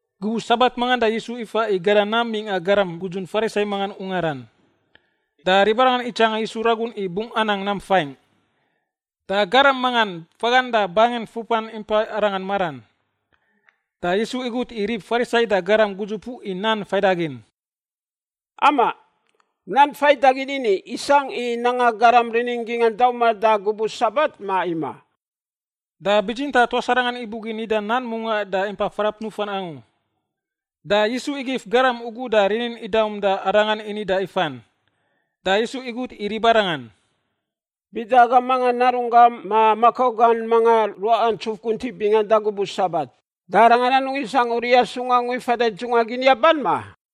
Gubuꞌ Sabat mangan da Yisu ifa i gada nam mingꞌa garam gudzun Farisai mangan ungaran. Da ribarangan itsanga Yisu ragun i bungꞌ anang nam faingꞌ. Da garam mangan fagan da bangin fupan impa Arangan maran. Da Yisu igut i rib Farisai da garam gudzupuꞌ i nan faidagin, “Amaꞌ, nan faidagin ini i isangꞌ i nanga garam gingꞌa rinin dauman da gubuꞌ Sabat, ma imaꞌ?” Da bitsintaꞌ tuas arangan ibugin nida nan mungaꞌ da impa frap nufan angu. Da Yisu igif garam ugu da rinin idaum da Arangan ini da ifan. Da Yisu igut i ribarangan, “Bida agam mangan narunggan ma makau gan mangan ruaꞌa ntsuf guntiꞌ bingan da gubuꞌ Sabat, da arangan anungꞌ isangꞌ uriꞌa sung angu i fada i dzungꞌa gin yaban, ma?”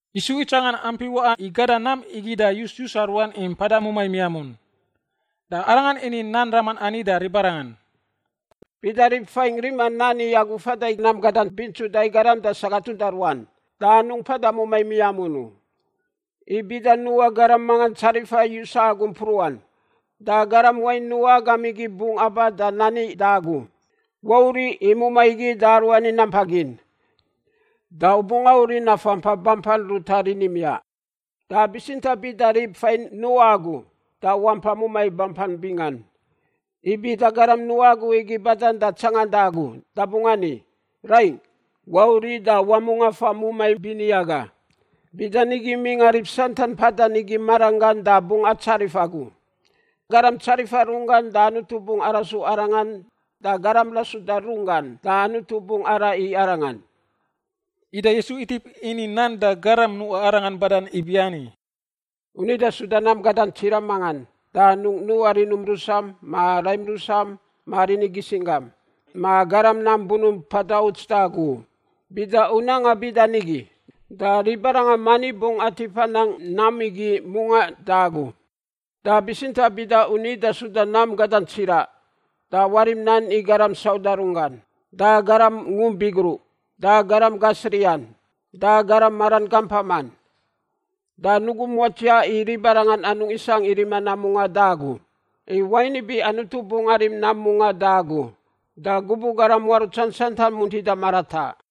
Yisu itsangan ampi waꞌa i gada nam igi da yus-yusa ruan i mpada mumai miamun. Da Arangan ini nan raman ani da ribarangan: “Bida rib fain rima nan i agu i fada i nam gadan bingsuda i garam da sagat uda ruan, da anungꞌ mpada mumai miamun u. I bida nuꞌa garam mangan tsarifa yusa agu mpruꞌan, da garam wain nuꞌa agam igi bungꞌ aba da nani da agu, ‘Wauriꞌ i mumai igi da aruani nampa gin.’ Da u bungꞌ auriꞌ nafa mpa bampan ruta rini miaꞌ. Da bitsintaꞌ bida rib fain nuꞌa agu da wampai mumai bampan bingan. I bida garam nuꞌa agu igi badan da tsanganda agu, da bungꞌ ani, ‘Raingꞌ, wauriꞌ da wamungꞌ afa mumai bini aga.’ Bidanigi mingꞌa rib santan mpadan igi marangan da bungꞌ atsarif agu. Garam tsarifa runggan da Anutu bungꞌ arasu arangan da garam rasuda runggan da Anutu bungꞌ araꞌ i arangan.” Ida Yisu itip ini nan da garam nuꞌa Arangan badan ibiani, “U nida suda nam gadan tsiraꞌ mangan, da anungꞌ nuꞌa rinum rusam, ma raim rusam, ma rini gisinggam, ma garam nam bunump mpada uts da agu u. Bida u nanga bida nigi, da ribarangan mani bungꞌ atip anang nam igi mungaꞌ da agu. Da bitsintaꞌ bida u nida suda nam gadan tsiraꞌ da warim nan i garam sauda runggan, da garam ngump bigruꞌ, da garam gasriꞌan, da garam maran gampaman. Da nugum watsiaꞌ i ribarangan anungꞌ isangꞌ i rima nam mungaꞌ da agu. I wain ibi Anutu bungꞌ arim nam mungaꞌ da agu da gubuꞌ garam muarutsan santan muntida marataꞌ.”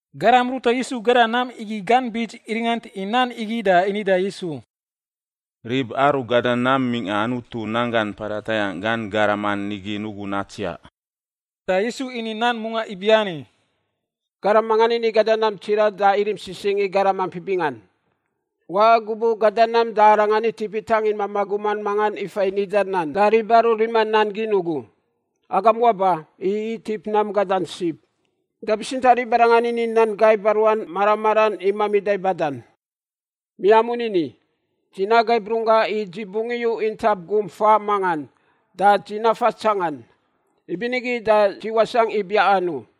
Garam ruta Yisu gada nam igi gan bits iringant i nan igi da ini da Yisu, “Rib aru gada nam mingꞌa Anutu nanggan mpada tayangꞌ gan garaman igi nugun natsiaꞌ.” Da Yisu ini nan mungaꞌ ibiani: “Garam mangan ini gada nam tsiraꞌ da irim sisingꞌ i garam ampi bingan. Waꞌa gubuꞌ gada nam da arangan itip itangin mamaꞌ guman mangan ifa i nida nan da rib aru rima nan gin ugu, ‘Agam waba, i itip nam gadan sib.’ “Da bitsintaꞌ ribarangan ini nan gaiba ruan mara maran i mamida i badan. Miamun ini, ‘Dzi nagaib runggaꞌ i dzi bungꞌ iyu intap gum faꞌ mangan da dzi nafa tsangan, ibinigi da dzi wasangꞌ i biaꞌan u.’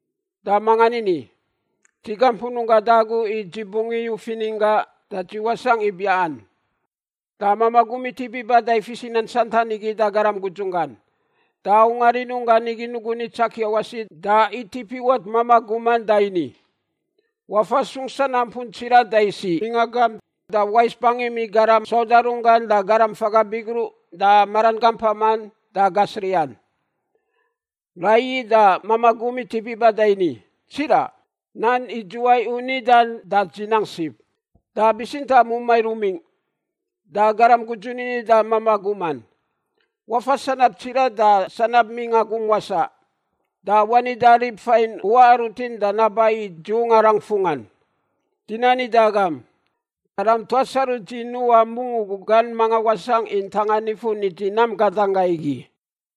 “Da mangan ini, ‘Dzi gampun runggangꞌ da agu i dzi bungꞌ iyu fininggaꞌ da dzi wasangꞌ i biaꞌan.’ “Da mamaꞌ gum itip iba da ifis i nan santan igi da garam gudzun gan. Da ungar rinunggan igi nugun itsakia wasi da itip iwat mamaꞌ guman da ini, ‘Wafa sung sanampun tsiraꞌ da isiꞌ mingꞌa gamp da wais bangim i garam sauda runggan da garam faga bigruꞌ da maran gampaman da gasriꞌan.’ “Raiyi da mamaꞌ gum itip iba da ini, ‘Tsiraꞌ, nan idzuwai u nidan, da dzi nang sib, da bitsintaꞌ mumai rumingꞌ.’ “Da garam gudzun ini da mamaꞌ guman, ‘Wafa sanab tsiraꞌ da sanab mingꞌa gum wasaꞌ, da wani da rib fain u waꞌa rutin da naba i dzi ungarangꞌ fungꞌan. Dzi nani da agam, garam tuas aru dzi nuꞌa mungꞌ ugu gan mangan wasangꞌ i ntanga nifun i dzi nam gadan gaꞌ igi.’”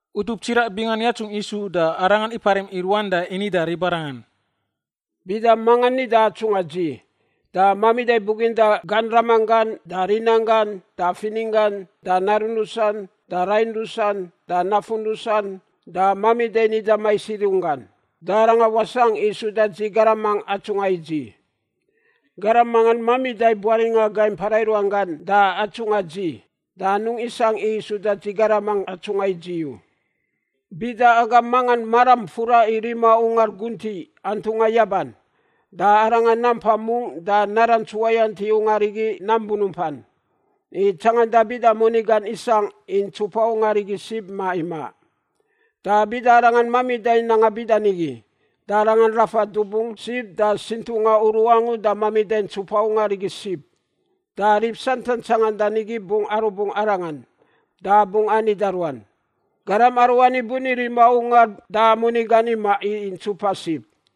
Utup tsiraꞌ bingan yatsungꞌ Yisu da Arangan iparim i ruan da ini da ribarangan, “Bida mangan nida atsungꞌa dzi, da mamida buginda gan ramanggan da rinanggan da fininggan da narun rusan da rain rusan da nafun rusan da mamida nida mais i runggan, da arangan wasangꞌ i suda dzi garamangꞌ atsungꞌa i dzi. Garam mangan mamida buaringꞌa gai mpara i ruan gan da atsungꞌa dzi, da anungꞌ isangꞌ i suda dzi garamangꞌ atsungꞌa i dzi u. “Bida agam mangan maran furan i rima ungar guntiꞌ antungꞌa yaban, da arangan nampa mungꞌ da narants uwayant i ungar igi nam bunumpan, i tsanganda bida moni gan isangꞌ i ntsupa ungar igi sib ma imaꞌ. Da bida arangan mamida nanga bida nigi, da arangan rafa dubung sib da sintunga uru angu da mamida ntsupa ungar igi sib, da rib santan tsangandan igi bungꞌ arubungꞌ arangan da bungꞌ ani da ruan, ‘Garam aruani buni rima ungar da moni gan imaꞌ i ntsupa sib.’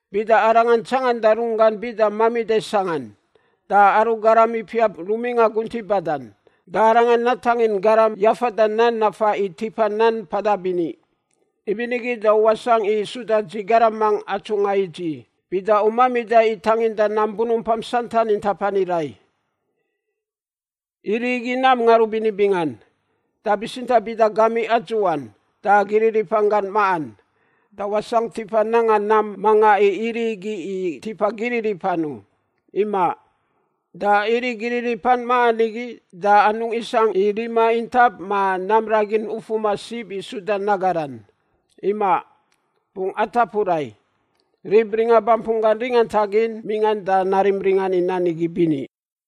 Bida arangan tsanganda runggan bida mamida sangꞌan, da aru garam ipiap rumingꞌa guntiꞌ badan, da arangan natangin garam yafada nan nafa i tipa nan mpada bini. Ibinigi da u wasangꞌ i suda dzi garamangꞌ atsungꞌa i dzi bida u mamida i tanginda nam bunumpam santan intap ani rai. “Iriꞌ igi nam ngarubini bingan. Da bitsintaꞌ bida gamiꞌ adzuꞌan da giriripan gan maꞌan, da wasangꞌ tipa nanga nam manga i iriꞌ igi i tipa giriripan u. Imaꞌ. Da iriꞌ giriripan maꞌan igi da anungꞌ isangꞌ i rima intap ma nam ragin ufuman sib i suda nagaran. Imaꞌ, bungꞌ atapu rai. Rib ringa bampun gan ringantagin mingꞌan da narim ringan i nan igi bini.”